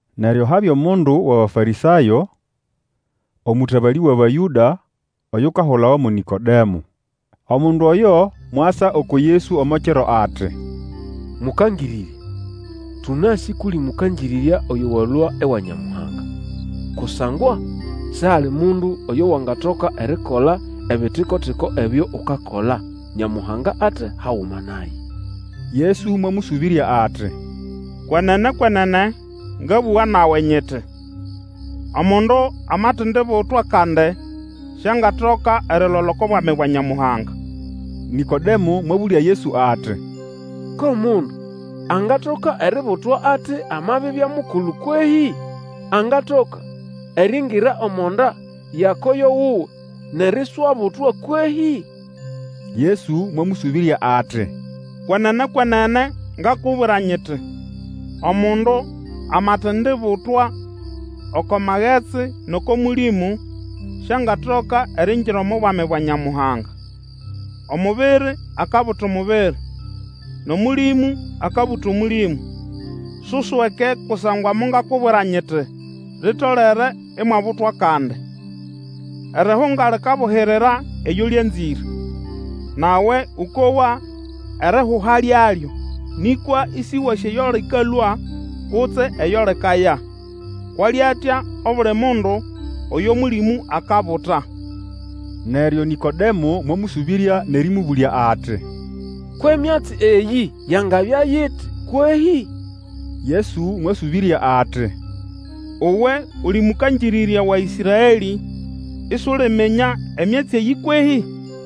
Neryo habya mundu wʼAbafarĩsayo, omũtabalĩ wʼAbayũda, oyukahulawa mo Nĩkodemo. Omundu oyo mwasa uku Yesu omo kiro, ati, Mũkangĩrĩrya, tũnasĩ kʼuli mũkangĩrĩrya oyo walũa ewa Nyamuhanga. Kusangwa sihali mundu oyo wangatoka erikola ebitiko-tiko ebyo ukakola, Nyamuhanga ate haguma naye. Yesu mwamũsũbĩrya ati, Kwenene, kwenene, ngabũga nawe, nyiti, Omundu amatendibutwa kandi, siangatoka erilola oko Bwami bwa Nyamuhanga. Nĩkodemo mwabũlya Yesu ati, ko mundu angatoka eributwa ati, amabibya mukulu kwehĩ? Angatoka eriingira omo nda ya koyo wuwe nʼeriswabutwa kwehĩ? Yesu mwamũsũbĩrya ati, Kwenene, kwenene, ngakubwira nyiti, Omundu amatendibutwa oko magetsi nʼoko Mũlĩmũ, siangatoka eriingira omo Bwami bwa Nyamuhanga. Omubiri akabuta omubiri, nʼOmũlĩmũ akabuta Omũlĩmũ. Susweke kusangwa mongakubwira nyiti, Litolere imwabutwa kandi. Erihunga likabuhirira eyo lyanzĩre, nawe ũkowa erihuha lyalyo, nĩkwa ĩsĩwasĩ eyo lĩkalũa, kutse eyo likaya; kwʼali atya obuli mundu oyo Mũlĩmũ akabuta. Neryo Nĩkodemo mwamũsũbĩrya nʼerĩmũbũlya ati, Kwʼemyatsi eyĩ yangabya iti kwehĩ? Yesu mwasũbĩrya ati, Uwe uli mũkangĩrĩrya wa Ĩsraelĩ isuliminya emyatsi eyĩ kwehĩ?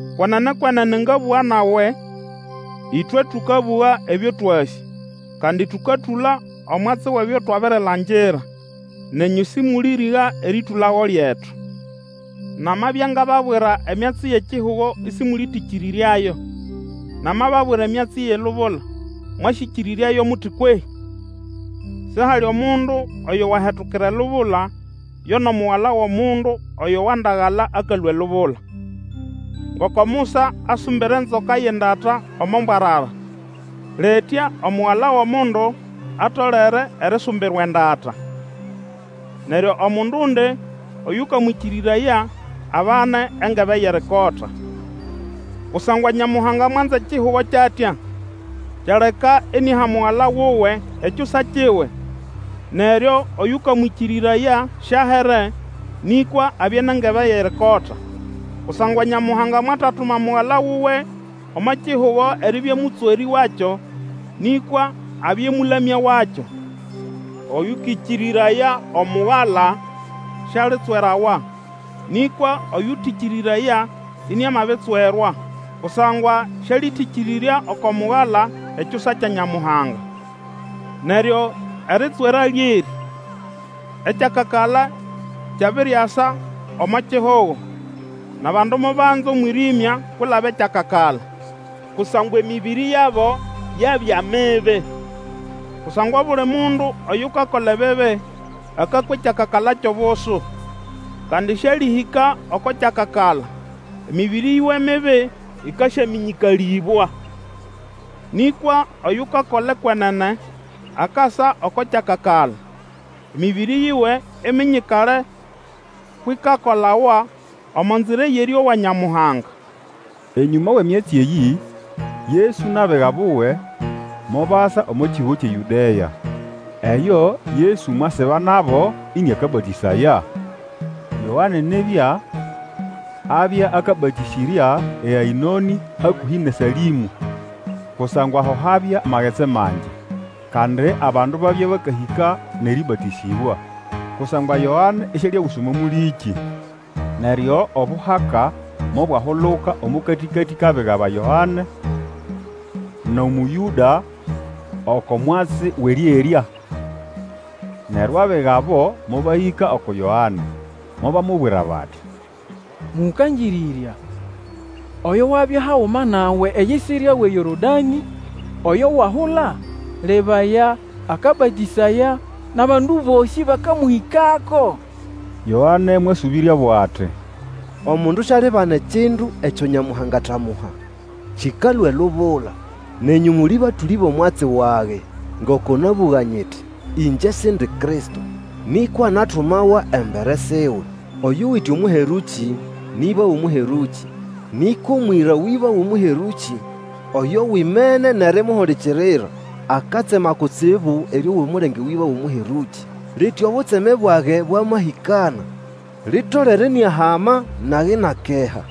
Kwenene, kwenene, ngabũga nawe, ĩtwe tũkabũga ebyo twasĩ, kandi tũkatũla omwatsi wʼebyo twabirilangira, nenyũ sĩmũlĩrĩga erĩtũlago lyetu. Namabya ngababwira emyatsi yʼekihugo ĩsĩmũlĩtĩkĩrĩryayo, namababwira emyatsi yʼelubula, mwasyĩkĩrĩryayo muti kwehĩ? Sihali omundu oyo wahetukira elubula, yo nʼomugala wʼOmundu oyo wandagala akalũa elubula. Ngoko Musa asumbira enzoka yʼendata omo mbwarara, litya Omugala wʼOmundu atolere erisumbirwa endata. Neryo Omundundi oyũkamwĩkĩrĩraya abane engebe yʼerikota. Kusangwa Nyamuhanga mwanza ekihugo kyʼatya, kyaleka iniaha Mugala wuwe, Ekyusa kiwe, neryo oyũkamwĩkĩrĩraya siahere, nĩkwa abye nʼengebe yʼerikota. Kusangwa Nyamuhanga mwatatuma Mugala wuwe omo kihugo eribya Mũtswerĩ wakyo, nĩkwa abye Omũlamya wakyo. Oyũkĩkĩrĩraya Omugala sialitswerawa, nĩkwa oyũtetĩkĩrĩrya iniamabitswerwa, kusangwa sĩalĩtĩkĩrĩrya oko Mugala, Ekyusa kya Nyamuhanga. Neryo eritswera lyerĩ, ekyakakala kyabiriasa omo kihugo, nʼabandu mobanza omwĩrĩmya kwilaba ekyakakala, kusangwa emĩbĩrĩ yabo yabya mibi. Kusangwa obuli mundu oyukakola ebibi akakwa ekyakakala kyʼobusu, kandi sĩalĩhĩka oko kyakakala, emĩbĩrĩ yiwe mibi ĩkasyamĩnyĩkalĩbwa. Nĩkwa oyukakola ekwenene akasa oko kyakakala, emĩbĩrĩ yiwe iminyikale kwʼikakolawa omo nzira yʼerĩowa Nyamuhanga. Enyũma wʼemyatsi eyĩ, Yesu nʼabiga buwe mobasa omo kihugo kyʼeYũdea. Eyo, Yesu mwasiba nabo ĩnĩakabatĩsaya. Yoane nibya abya akabatĩsĩrya eAĩnonĩ hakũhĩ nʼeSalĩmũ, kusangwa ho habya magetsi mangi; kandi abandu babya bakahĩka nʼerĩbatĩsĩbwa. Kusangwa Yoane isialiaguswa omo mũlĩkĩ. Neryo obuhaka mobwahuluka omo katĩkatĩ kʼabiga ba Yoane nʼOmũyũda oko mwatsi wʼerĩerya. Neryo abiga abo mobahĩka uku Yoane, mobamubwira bati, Mũkangĩrĩrya, oyo wabya haguma nawe eyisirya wʼeYorodanĩ, oyo wahula, lebaya, akabatĩsaya, nʼabandu bosĩ bakamũhĩkako! Yoane mwasũbĩryabo ati, Omundu sialibana ekindu ekyo Nyamuhanga atamuha, kĩkalũa elubula. Nenyũ muli batũlĩ bʼomwatsi wage ngoko nabũga nyiti, Ingye Sindi Kristo, nĩkwa natumawa embere siwe. Oyuwite Omũherũkĩ, nĩ ĩba wʼomũherũkĩ; nĩkwa omwĩra wʼĩba wʼomũherũkĩ, oyo wimene nʼerimuhulikirira, akatsema kutsibu erĩowa omulenge wʼĩba wʼomũherũkĩ. Litya obutseme bwage bwamahĩkana. Litolere iniahama, nage inakeha.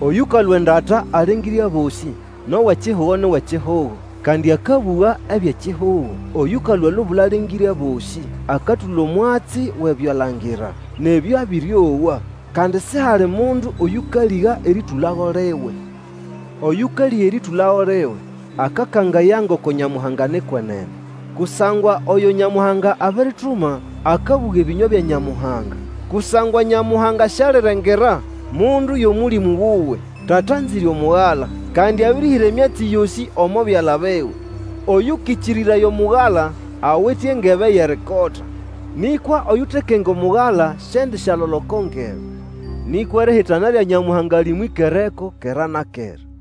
Oyũkalũa endata alengĩre abosĩ, nʼowʼekihugo ni wʼekihugo, kandi akabũga ebyʼekihugo. Oyũkalũa elubula alengĩre abosĩ. Akatũla omwatsi wʼebyo abirilangira nʼebyo abĩrĩowa, kandi sihali mundu oyũkalĩga erĩtũlago liwe. Oyũkalĩga erĩtũlago liwe, akakangaya ngoko Nyamuhanga ni kwenene. Kusangwa oyo Nyamuhanga abirituma akabũga ebĩnywa bya Nyamuhanga, kusangwa Nyamuhanga sialirengera mundu yʼOmũlĩmũ wuwe. Tata anzĩre Omugala, kandi abĩrĩhĩra emyatsi yosĩ omo byala biwe. Oyũkĩkĩrĩraya Omugala awite engebe yʼerikota; nĩkwa oyutekenga Omugala siendisyalola oko ngebe, nĩkwa erihitana lya Nyamuhanga lĩmwĩkereko kera na kera.